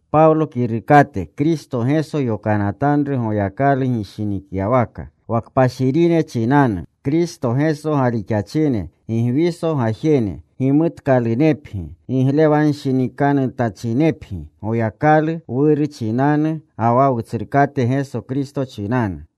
Pawlo kirukate, Kristo Geso yokanatanru Goyakalu gishinikyawaka. Wa kpashirine chinanu, Kristo Geso galixachine, Gigwiso gajene. Gimutkalunepgi. Giglewanshinikanutachinepgi Goyakalu Wuru chinanu ga wa Wutsrukate Geso Kristo chinanu.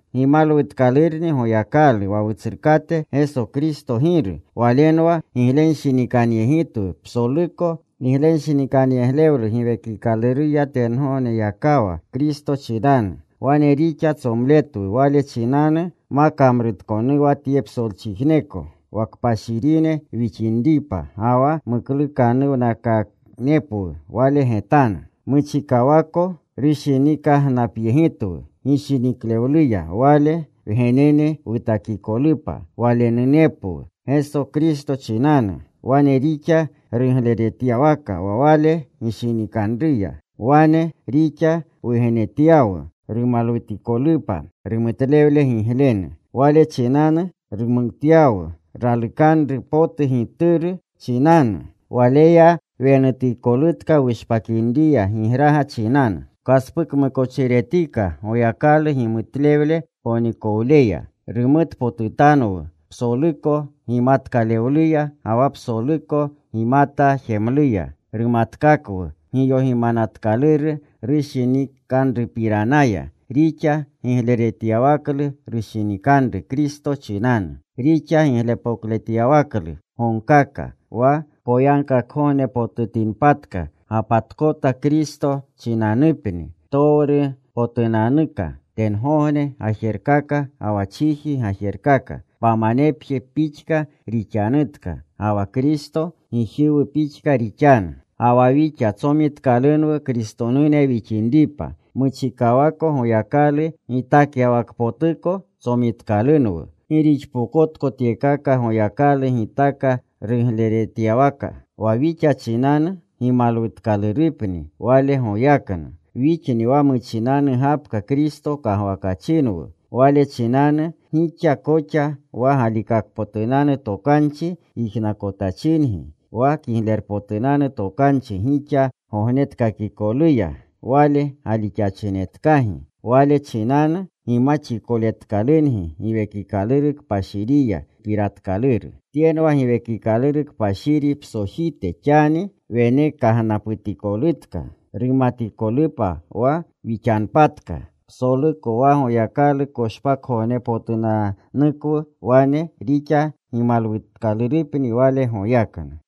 Gimalwutkalurni Goyakalu wa Wutsrukate Geso Kristo Giru. Walenwa giglenshinikanyegitwu psoluko giglenshinikanyeglewlu Giwekikaluruya tengogneyakawa Kristo chinanu. Wane rixa tsomletwu Wale chinanu ma kamrutkonuwa tye psolchijneko, wa kpashirine wixinripa ga wa muklukanuwnakanepwu Wale getanu. Muchikawako rushinikagnapyegitwu gishiniklewluya Wale wgenene wutakikolupa, Walenunepwu Geso Kristo chinanu. Wane rixa rugleretyawaka wa Wale gishinikanruya. Wane rixa wugenetyawu, rumalwutikolupa rumutlewle giglenu. Wale chinanu rumutyawu ralukanru potu Gituru chinanu. Waleya wenutikolutka wushpakinriya gigraga chinanu. Wkaspukmukochiretika Goyakalu gimutlewle ponikowleya. Rumutpotutanwu psoluko gimatkalewluya ga wa psoluko gimata jemluya. Rumatkakwu giyogimanatkaluru rushinikanrupiranaya; rixa gigleretyawaklu rushinikanru Kristo chinanu. Rixa giglepokletyawaklu gogikaka, wa poyagkakgognepotutinpatka, gapatkota Kristo chinanupni ptowrupotunanuka, tengogne gajerkaka ga wa chiji gajerkaka. Pamanepje pixka rixanutka. Ga wa Kristo, gijiwu pixka rixanu. Ga wa wixa tsomitkalunwu Kristonune wixinripa. Muchikawako Goyakalu gitakyawakpotuko tsomitkalunwu. Gi rixpokotko tyekaka Goyakalu gitaka rugleretyawaka. Wa wixa chinanu gimalwutkalurupni Wale goyaknu. Wixni wa muchinanu gapka Kristo kagwakyachinwu. Wale chinanu gixa koxa wa galikakpotunanu tokanchi yijnakotachingi, wa Kiglerpotunanu Tokanchi gixa gognetkakikoluya, Wale galixachinetkagi. Wale chinanu gimaxikoletkalungi Giwekikaluru Kpashiriya gipiratkaluru. Tyenwa Giwekikaluru Kpashiri psojite xani wenekagnaputikolutka, rumatikolupa wa wixanpatka psoluko wa Goyakalu koshpakgognepotunanukwu. Wane rixa gimalwutkalurupni Wale goyaknu.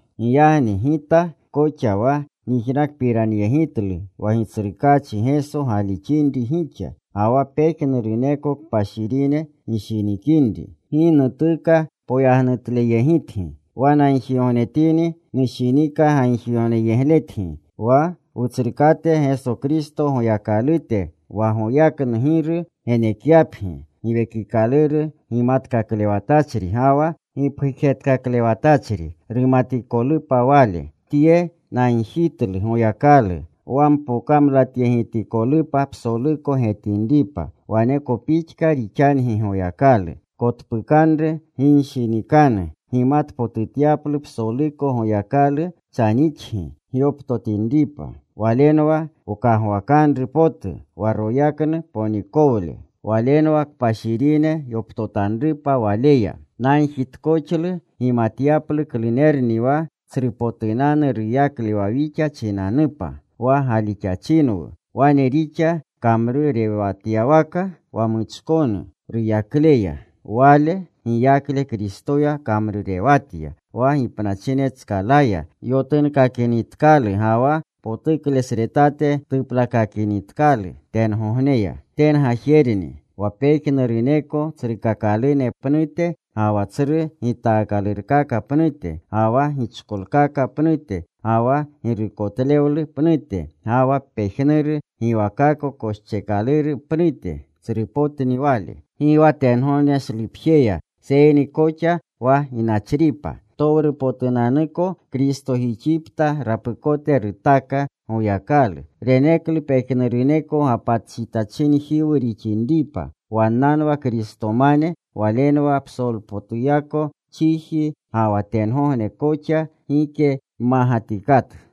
Giyagni gita koxa wa nyijnakpiranyegitlu wa Gitsrukaachi Geso galixinri gixa, ga wa pejnuruneko kpashirine gishinikinri, gi nutuka poyagnutleyegitgi. Wa nagjigognetini nushinika gagjigogneyegletgi. Wa Wutsrukate Geso Kristo Goyakalute, wa goyaknu Giru genekyapgi Giwekikaluru gimatkaklewatachri ga wa gipgujetkaklewatachri, rumatikolupa Wale. Tye nagjitlu Goyakalu: Wa mpokamlatyegitikolupa psoluko getinripa, waneko pixka rixangi Goyakalu. Kotpukanru ginshinikanu gimatpotutyaplu psoluko Goyakalu chanixgi gyoptotinripa. Walenwa wkagwakanru potu, wa royaknu ponikowle. Walenwa kpashirine yoptotanrupa Waleya. Nagjitkoxlu gimatyaplu klunerni wa tsrupotunanu ruyakle wa wixa chinanupa, wa galixachinwu. Wane rixa kamrurewatyawaka wa muchkonu ruyakleya. Wale giyakle Kristoya kamrurewatya, wa gipnachinetskalaya yotunkakinitkalu ga wa potuklesretate tuplakakinitkalu tengogneya. Tengajerni. Wa pejnuruneko tsrukakalune pnute, ga wa tsru gitaakalurkaka pnute, ga wa gichkolkaka pnute, ga wa girukotlewlu pnute, ga wa pejnuru giwakako koscheekaluru pnute, tsrupotni Wale. Gi wa tyegogneshlupjeya, seyni koxa wa ginachripa. Ptowrupotunanuko Kristojixipta rapukote rutaka Goyakalu. Reneklu pejnuruneko gapatjetachinjiwu rixinripa. Wannanwa Kristomane. Walenwa psolpotuyako chiji ga wa tengogne koxa gike mmagatikatu.